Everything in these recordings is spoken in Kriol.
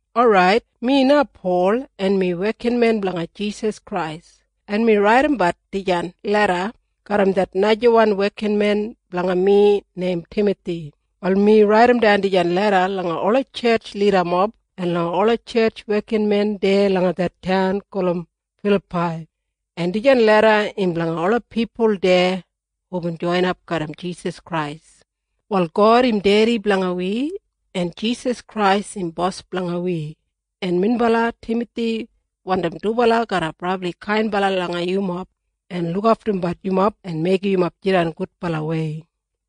Orait, mi na Pol, en mi wekinmen blanga Jisas Krais, en mi raidimbat dijan leda garram det najawan wekinmen blanga mi neim Timathi. Wal mi raidimdan dijan leda langa ola tjetj lidamob en langa ola tjetj wekinmen deya langa det taun gulum Filapai, en dijan leda im blanga ola pipul deya hubin joinap garram Jisas Krais. Wal God im Dedi blanga wi, en Jisas Krais im Bos blanga wi, en minbala Timathi wandim dubala garra brabli kainbala langa yumob en lukaftumbat yumob en meigim yumob jidan gudbalawei.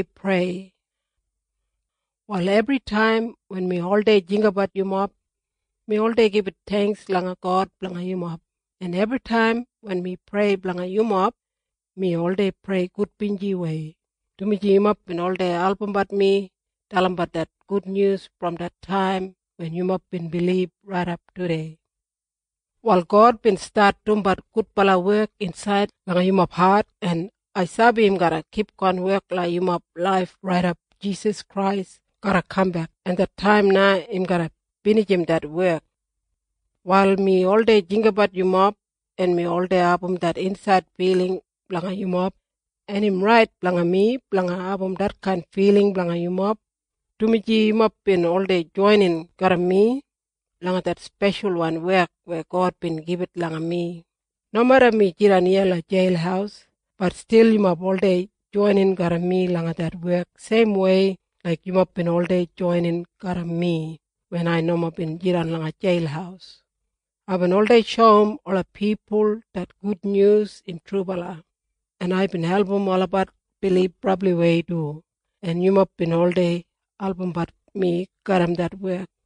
Prayer Wal ebritaim wen mi oldei jinggabat yumob, mi oldei gibit theingks langa God blanga yumob. En ebritaim wen mi prei blanga yumob, mi oldei prei gudbinjiwei, dumaji yumob bin oldei albumbat mi dalimbat det gudnyus brom det taim wen yumob bin bilib raidap tudei. Wal God bin stat dumbat gudbala wek insaid langa yumob hat, en ai sabi im garra kipgon wek langa yumob laif raidap Jisas Krais garra kambek, en det taim na im garra binijim det wek. Wal mi oldei jinggabat yumob, en mi oldei abum det insaid filing blanga yumob, en im rait blanga mi blanga abum detkain filing blanga yumob, dumaji yumob bin oldei joinin garram mi langa det speshalwan wek weya God bin gibit langa mi. Nomeda mi jidan iya langa jeil, bat stil yumob oldei joinin garram mi langa det wek seimwei laik yumob bin oldei joinin garram mi wen ai nomo bin jidan langa jeil. Aibin oldei shoum ola pipul det gudnyus im trubala, en aibin album olabat bilib brabliwei du, en yumob bin oldei albumbat mi garram det wek.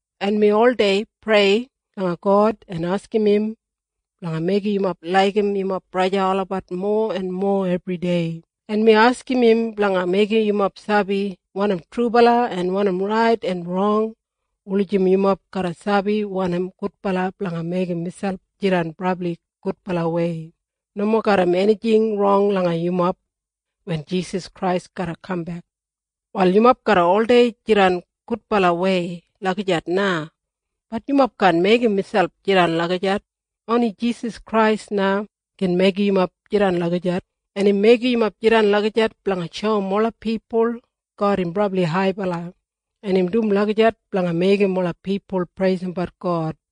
En mi oldei prei langa God en askim im blanga meigim yumob laigim yumob braja en sista olabat mowa en mowa ebridei, en mi askim im blanga meigim yumob sabi wanim trubala en wanim rait en rong wulijim yumob garra sabi wanim gudbala blanga meigim miselp jidan brabli gudbalawei, nomo garram enijing rong langa yumob wen Jisas Krais garra kambek. Wal yumob garra oldei jidan gudbalawei lagijat na. Bat yumob kaan meigim miselp jidan lagijat. Oni Jisas Krais na gin meigim yumob jidan lagijat. En im meigim yumob jidan lagijat blanga shoum ola pipul God im brabli haibala, en im dum lagijat blanga meigim ola pipul preisimbat God.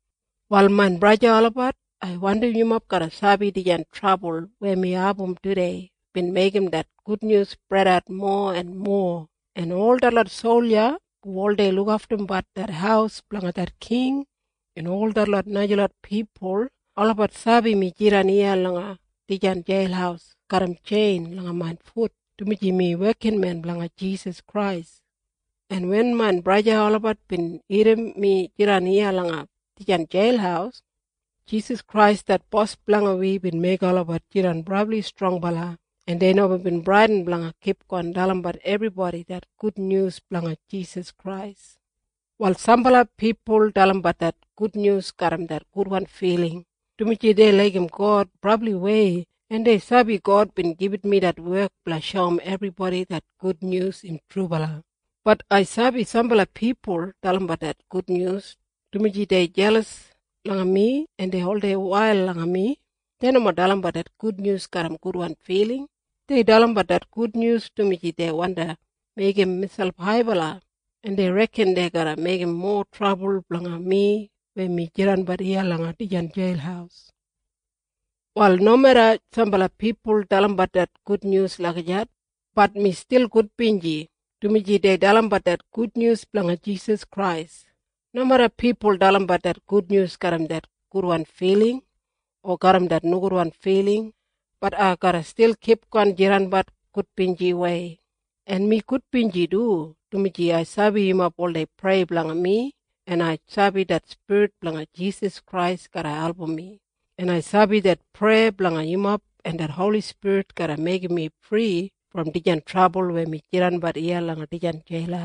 Wal main braja en sista olabat, ai wandim yumob garra sabi dijan trabul weya mi abum tudei bin meigim det gudnyus spredat mowa en mowa, en ol detlot solja hu oldei lukaftumbat det haus blanga det king en ol detlot najalot pipul olabat sabi mi jidan iya langa dijan jeil garram tjein langa main fut dumaji mi wekinmen blanga Jisas Krais, en wen main braja en sista olabat bin irrim mi jidan iya langa dijan jeil, Jisas Krais det Bos blanga wi bin meigim olabat jidan brabli strongbala, en dei nomo bin bradin blanga kipgon dalimbat ebribodi det gudnyus blanga Jisas Krais. Wal sambala pipul dalimbat det gudnyus garram det gudwan filing, dumaji dei laigim God brabliwei, en dei sabi God bin gibit mi det wek blanga shoum ebribodi det gudnyus im trubala. Bat ai sabi sambala pipul dalimbat det gudnyus dumaji dei jelas langa mi en dei oldei wail langa mi. Dei nomo dalimbat det gudnyus garram gudwan filing. Dei dalimbat det gudnyus dumaji dei wandi meigim miselp haibala, en dei reken dei garra meigim mowa trabul blanga mi weya mi jidanbat iya langa dijan jeil. Wal nomeda sambala pipul dalimbat det gudnyus lagijat, bat mi stil gudbinji, dumaji dei dalimbat det gudnyus blanga Jisas Krais. Nomeda pipul dalimbat det gudnyus garram det gudwan filing o garram det nogudwan filing, bat ai garra stil kipgon jidanbat gudbinjiwei. En mi gudbinji du, dumaji ai sabi yumob oldei prei blanga mi, en ai sabi det Spirit blanga Jisas Krais garra album mi, en ai sabi det preya blanga yumob en det Holi Spirit garra meigim mi fri brom dijan trabul weya mi jidan iya langa dijan jeil.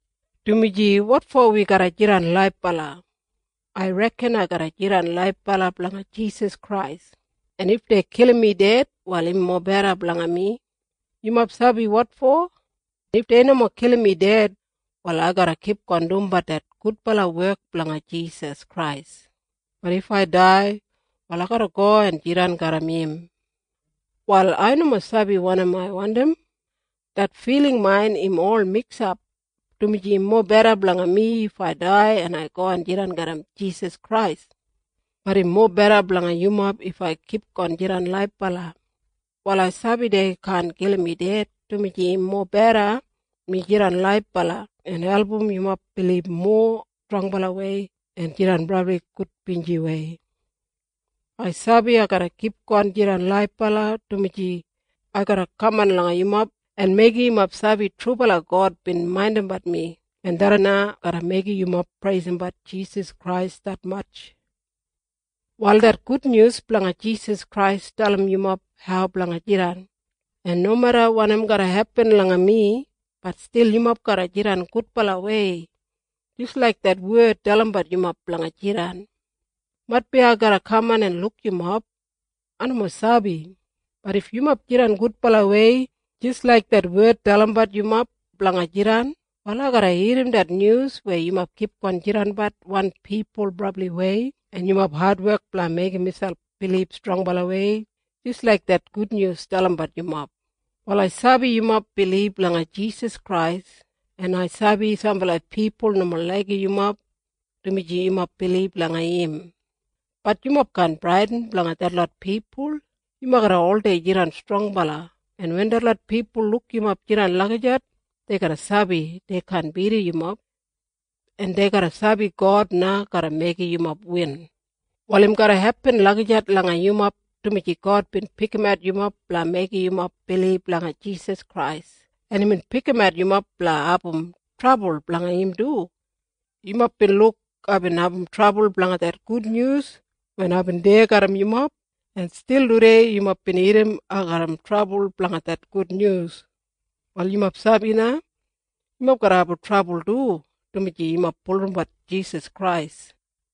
Dumaji wotfo wi garra jidan laibala? Ai reken ai garra jidan laibala blanga Jisas Krais. En if dei kilim mi ded, wal im mobeda blanga mi. Yumob sabi wotfo? If dei nomo kilim mi ded, wal ai garra kipgon dumbat det gudbala wek blanga Jisas Krais. Bat if ai dai, wal ai garra go en jidan garram im. Wal ai nomo sabi wanim ai wandim. Det filing main im ol miksap, dumaji im mobeda blanga mi if ai dai en go en jidan garram Jisas Krais. Bat im mobeda blanga yumob if ai kipgon jidan laibala. Wal ai sabi dei kaan kilim mi ded, dumaji im mobeda mi jidan laibala en album yumob bilib mowa strongbalawei en jidan brabli gudbinjiwei. Ai sabi ai garra kipgon jidan laibala, dumaji ai garra kaman langa yumob en meigim yumob sabi trubala God bin maindimbat mi, en tharran na garra meigim yumob preisimbat Jisas Krais detmatj. Wal det gudnyus blanga Jisas Krais dalim yumob hau blanga jidan, en nomeda wanim garra hepin langa mi, bat stil yumob garra jidan gudbalawei jis laik det wed dalimbat yumob blanga jidan. Maitbi ai garra kaman en luk yumob. Ai nomo sabi. Bat if yumob jidan gudbalawei jis laik det wed dalimbat yumob blanga jidan, wal ai garra irrim det nyus weya yumob kipgon jidanbat wan pipul brabliwei en yumob adwek blanga meigim miselp bilib strongbalawei jis laik det gudnyus dalimbat yumob. Wal ai sabi yumob bilib langa Jisas Krais. En ai sabi sambala pipul nomo laigim yumob dumaji yumob bilib langa im. Bat yumob kaan bradin blanga detlot pipul. Yumob garra oldei jidan strongbala, en wen detlot pipul luk yumob jidan lagijat, dei garra sabi dei kaan bidim yumob, en dei garra sabi God na garra meigim yumob win. Wal im garra hepin lagijat langa yumob, dumaji God bin pikimat yumob blanga meigim yumob bilib langa Jisas Krais, en imbin pikimat yumob blanga abum trabul blanga im du. Yumob bin luk aibin abum trabul blanga det gudnyus wen aibin deya garram yumob, en stil tudei yumob bin irrim ai garram trabul blanga det gudnyus. Wal yumob sabi na? Yumob garra abum trabul du, dumaji yumob bulurrumbat Jisas Krais.